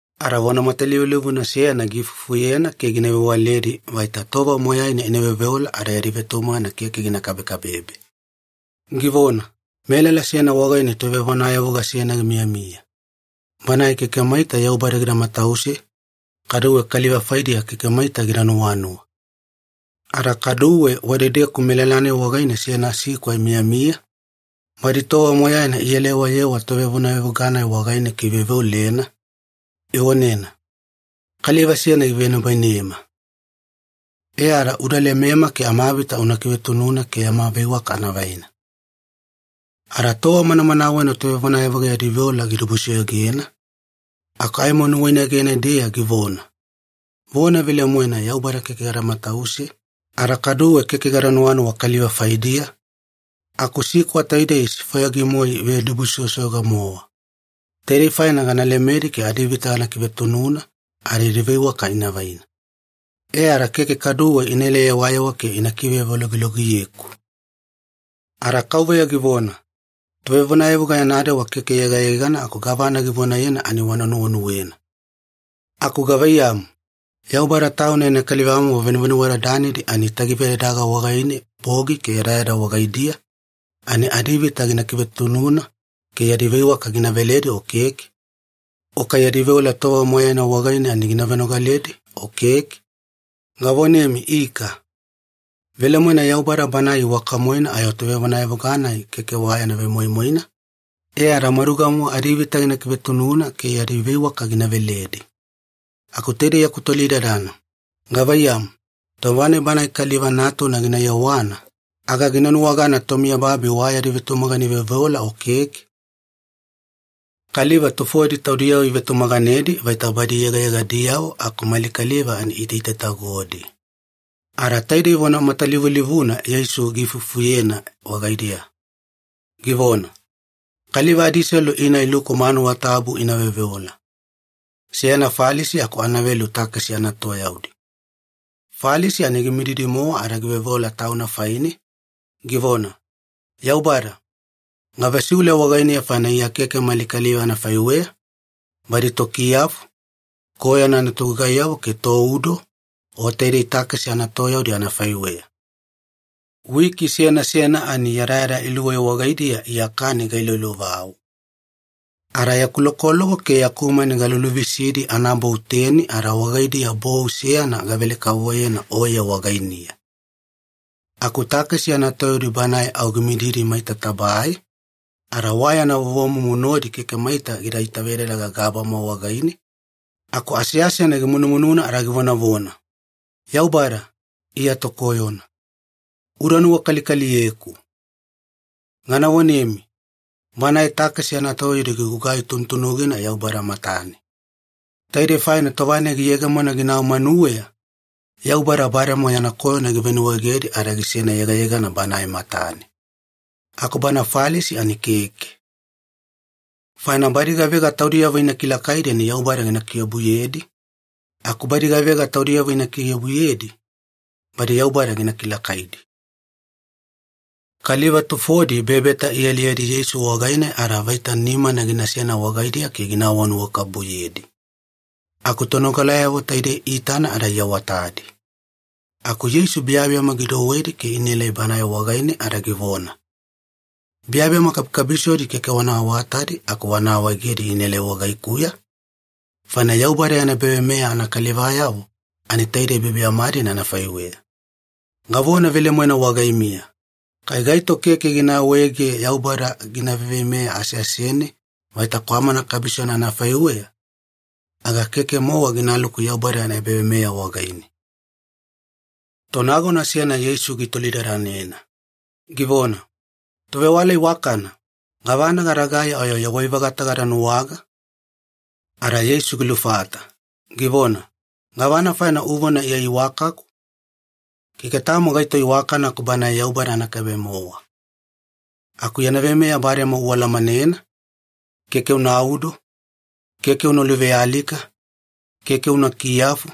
Ada vona matalivulivuna seyana giifufuyena ke gina vewaledi vaita tova moyaina ina veoveola ada yadi vetumagana keke gina kabekabebe. Givona, “Melala seyana wagaine tovevonayavuga seyana gimiyamiya. Banae keke maita Yaubada gida matause, kaduwe kaliva faidiya keke maita gida nuwanuwa. Ada kaduwe wadedeku melala-nai wagaine seyana sikwa imiyamiya, badi tova moyaina ielayewayewa tovevonayavuga-nai wagaine ke iveoveolena, ivonena, ‘Kaliva seyana givenibainema. E ada uda lemema ke amavita una kivetununa ke yama veiwaka anavaina.’ “Ada tova manamanawena tovevonayavuga yadi veola gidibusoyogena, aku aimo nuwainegene-deya givona, ‘Vona velemoena Yaubada keke gada matause, ada kaduwe keke gada nuwanuwa kaliva faidiya, aku sikwa taidei isifwayagi-moe ivedibusoyosoyoga-mowa. Taidei faina gana lemedi ke adivita gana kivetununa ada yadi veiwaka ina vaina. E ada keke kaduwe ina elayewayewa ke ina kivevologilogiyeku.’” Ada Kauveya givona, “Tovevonayavuga yana dewa keke yegayegana aku gavana givonayena ani wana nuwenuwena. Aku gavaiyamu, Yaubada Tauna yana kalivamomo venuvenuwadadanidi ani itagivedadaga wagaine bogi ke yadayada wagaidiya, ani adivita gina kivetununa ke yadi veiwaka gina veledi o keke? O kai yadi veola tova moyaina wagaine ani gina venogaledi o keke? Gavonemi ika. Velemoena Yaubada Banae iwaka-moena ayo tovevonayavuga-nai keke wa yana vemoimoina, e ada maduga-mowa adivita gina kivetununa ke yadi veiwaka gina veledi. Aku taidei yaku tolidadana, gavaiyamu, tova-nai Banae Kaliva Natuna gina yewana, aga gina nuwagana tomiyababi wa yadi vetumagana iveoveola o keke?” Kaliva tufodi taudiyavo ivetumaganedi vaita badi yegayegadiyavo aku mali kaliva ani iitaitatagodi. Ada taidei vona matalivulivuna Yeisu giifufuyena wagaidiya, givona, “Kaliva adiselu ina iluku manuwa tabu ina veoveola. Seyana Falisi aku anavelu takesi anatoyaudi. Falisi ani gimididi-mowa ada giveoveola tauna faine, givona, ‘Yaubada, gavesiule wagainiya faina Iya keke mali kaliva anafaiweya, badi tokiyafu, koyona anatogugaiyavo ke toudo, o taidei takesi anatoyaudi anafaiweya. Wiki seyana seyana ani yadayada iluwei wagaidiya Iya kani gailoilovau. Ada yaku lokoloko ke yaku mani galuluvisidi anabou teni ada wagaidiya bou seyana gavele-kavovoyena Oye wagainiya.’ “Aku takesi anatoyaudi banae au gimididi maita tabae, ada wa yana vovomumu nodi keke maita gida itavedadaga gabama wagaine, aku aseasena gimunumununa ada givonavona, ‘Yaubada, Iya tokoyona. Uda nuwakalikaliyeku.’ “Gana vonemi, banae takesi anatoyaudi gigugai tunutunugina Yaubada matane. Taidei faina tova-nai giyegemona ginau manuweya, Yaubada bademowa yana koyona givenuwaegedi ada gisena yegayegana Banae matane. Aku bana Falisi ani keke. Faina badi gavega taudiyavo ina kilakaidi ani Yaubada gina kiobuyedi, aku badi gavega taudiyavo ina kiobuyedi, badi Yaubada gina kilakaidi.” Kaliva tufodi bebeta ialiyedi Yeisu wagaine ada vaita nimana ginasena wagaidiya ke gina awanuwakabubuyedi. Aku tonogalayavo taidei iitana ada iawatadi. Aku Yeisu biyabiyama gidouwedi ke inaelai Bana wagaine ada givona, “Biyabiyama kabikabisodi keke wana awatadi aku wana awaegedi inaelai wagaikuya, faina Yaubada yana ebaveimeya anakalivayavo ani taide biyabiyama-dina anafaiweya. Gavona velemoena wagaimiya, kai gaito keke gina awaege Yaubada gina veiveimeya aseasene vaita kwamana kabisona anafaiweya, aga keke-mowa ginaluku Yaubada yana ebaveimeya wagaine.” Tonagona seyana Yeisu gitolidadanena, givona, “Tovewala iwakana, gavana gadagai ayo yawai-vagata gada nuwaga?” Ada Yeisu gilufata, givona, “Gavana faina uvona Iya iwakaku? Keke tamo gaito iwakana aku Banae Yaubada anakaibe-mowa. Aku yana veimeya bademowa ualamanena, ‘Keke unaudo, keke una luvealika, keke una kiyafu,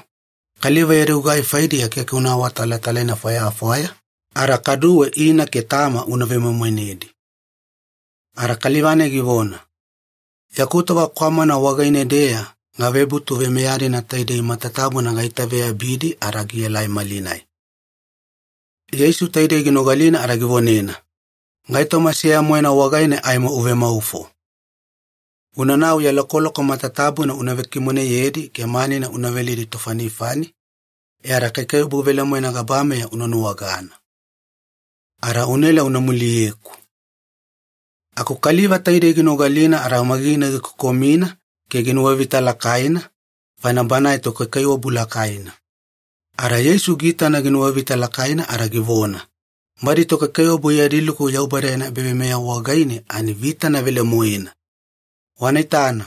kaliva yadi gugai faidiya keke una awatalatalaina fwayafwaya, ada kaduwe ina ke tama una vemoimoinedi.’” Ada kaliva-nai givona, “Yaku tova kwamana wagaine-deya gavebutu veimeya-dina taidei matatabuna gaitaveyabidi ada gielai malinai.” Yeisu taidei ginogalina ada givonena, “Gaitoma seya-moena wagaine aimo uvemaufo. Unanau ya lokoloko matatabuna una vekimoneyedi ke manina una veledi tofanifani, e ada kaikaiwabu velemoena gabameya una nuwagana. Ada unaela una muliyeku.” Aku kaliva taidei ginogalina ada au magigina gikokomina ke ginuwavita lakaina, faina banae tokaikaiwabu lakaina. Ada Yeisu giitana ginuwavita lakaina ada givona, “Badi tokaikaiwabu yadi luku Yaubada yana ebaveimeya wagaine ani vitana velemoena! Wana itana,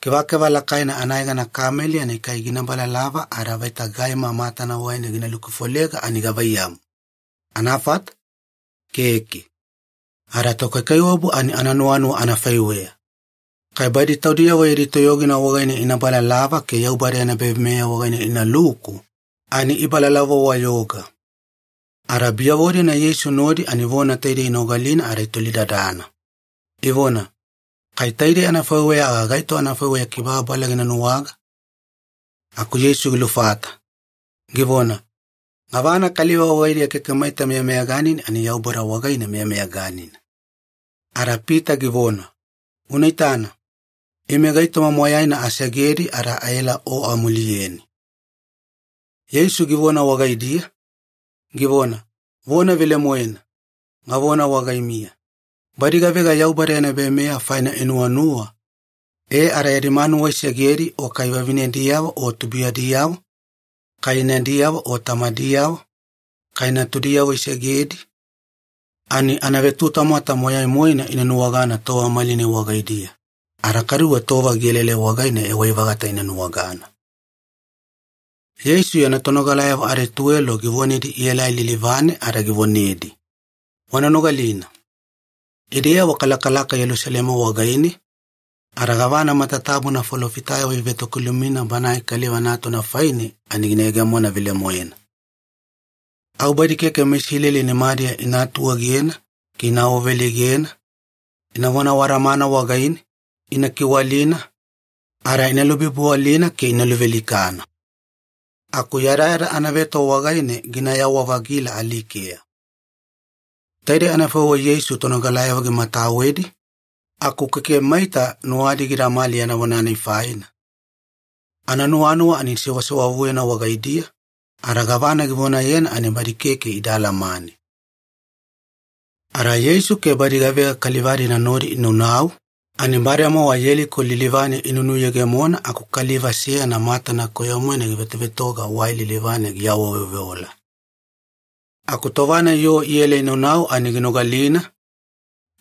kevakeva lakaina anayegana kameli ani kai gina balalava ada vaita gaima matana wagaine gina lukufolega ani gavaiyamu, anafata? Keke. Ada tokaikaiwabu ani ananuwanuwa anafaiweya. Kai badi taudiyavo yadi toyogina wagaine ina balalava ke Yaubada yana ebaveimeya wagaine inaluku, ani ibalalava-wayoga.” Ada biyavo-dina Yeisu nodi ani vona taidei inogalina ada itolidadana, ivona, “Kai taidei anafaiweya aga gaito anafaiweya kibababala gina nuwaga?” Aku Yeisu gilufata, givona, “Gavana kaliva wagaidiya keke maita meyameyaganina ani Yaubada wagaine meyameyaganina.” Ada Pita givona, “Una itana, ime gaitoma moyaina asegedi ada aela O amuliyeni.” Yeisu givona wagaidiya, givona, “Vona velemoena, gavona wagaimiya, badi gavega Yaubada yana ebaveimeya faina inuwanuwa e ada yadi manuwa isegedi o kai vavinediyavo o tubuiyadiyavo, kai inadiyavo o tamadiyavo, kai natudiyavo isegedi, ani anavetutamwata moyai-moena ina nuwagana tova malinai wagaidiya, ada kaduwe tova gielaelai wagaine yawai-vagata ina nuwagana.” Yeisu yana tonogalayavo adituwelo givonedi ielai lilivane ada givonedi, “Wana nogalina. Ideyavo kalakalaka Yelusalema wagaine, ada gavana matatabuna falofitayavo ivetokilumina Banae Kaliva Natuna faine ani gina yegemona velemoena. Au badi keke meIsileli nimadiya ina atuegena ke ina awaveleigena, inavona awadamana wagaine, ina kiwalina, ada ina lubibiwalina ke ina luvealikana. Aku yadayada anaveto wagaine ginayawa-vagila alikeya.” Taidei anafaiweya Yeisu tonogalayavo gimatawedi, aku keke maita nuwadi gidamali yana vona-nai faina. Ananuwanuwa ani sewasewavuyena wagaidiya, ada gavana givonayena ani badi keke ida alamane. Ada Yeisu ke badi gavega kaliva-dina nodi inaunau, ani bademowa Yeliko lilivane inunuyegemona aku kaliva seyana matana koyo-moena givetovetoga wai lilivane giawaveoveola. Aku tova-nai yoo iela inaunau ani ginogalina,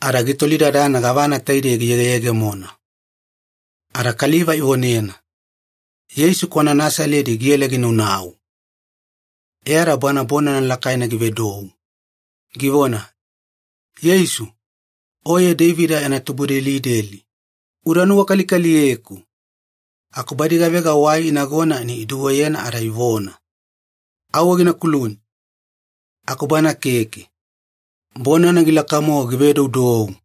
ada gitolidadana gavana taidei giyegeyegemona. Ada kaliva ivonena, “Yeisu kwana Nasaledi giela ginaunau.” E ada banae bonana lakaina givedou, givona, “Yeisu! Oye Deivida yana tubudelideli, uda nuwakalikaliyeku!” Aku badi gavega wai inagona ani iduweyena ada ivona, “Auwe gina kuluni!” Aku bana keke. Bonana gilaka-mowa givedoudou,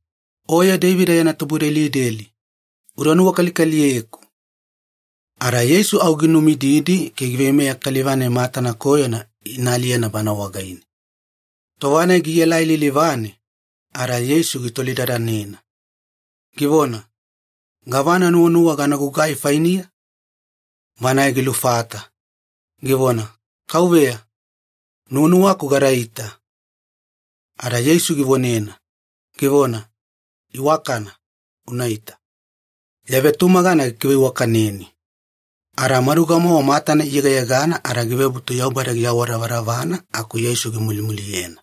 “Oye Deivida yana tubudelideli, uda nuwakalikaliyeku!” Ada Yeisu au ginumididi ke giveimeya kaliva-nai matana koyona ina aliyena Bana wagaine. Tova-nai gielai lilivane, ada Yeisu gitolidadanena, givona, “Gavana nuwanuwa gana gugai fainiya?” Banae gilufata, givona, “Kauveya, nuwanuwaku gadaita.” Ada Yeisu givonena, givona, “Iwakana, unaita. Ya vetumagana gikiveiwakaneni.” Ada maduga-mowa matana iyegayegana ada givebutu Yaubada giawadavadavana aku Yeisu gimulimuliyena.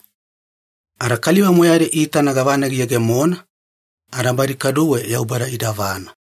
Ada kaliva moyaidi iitana gavana giyegemona, ada badi kaduwe Yaubada idavana.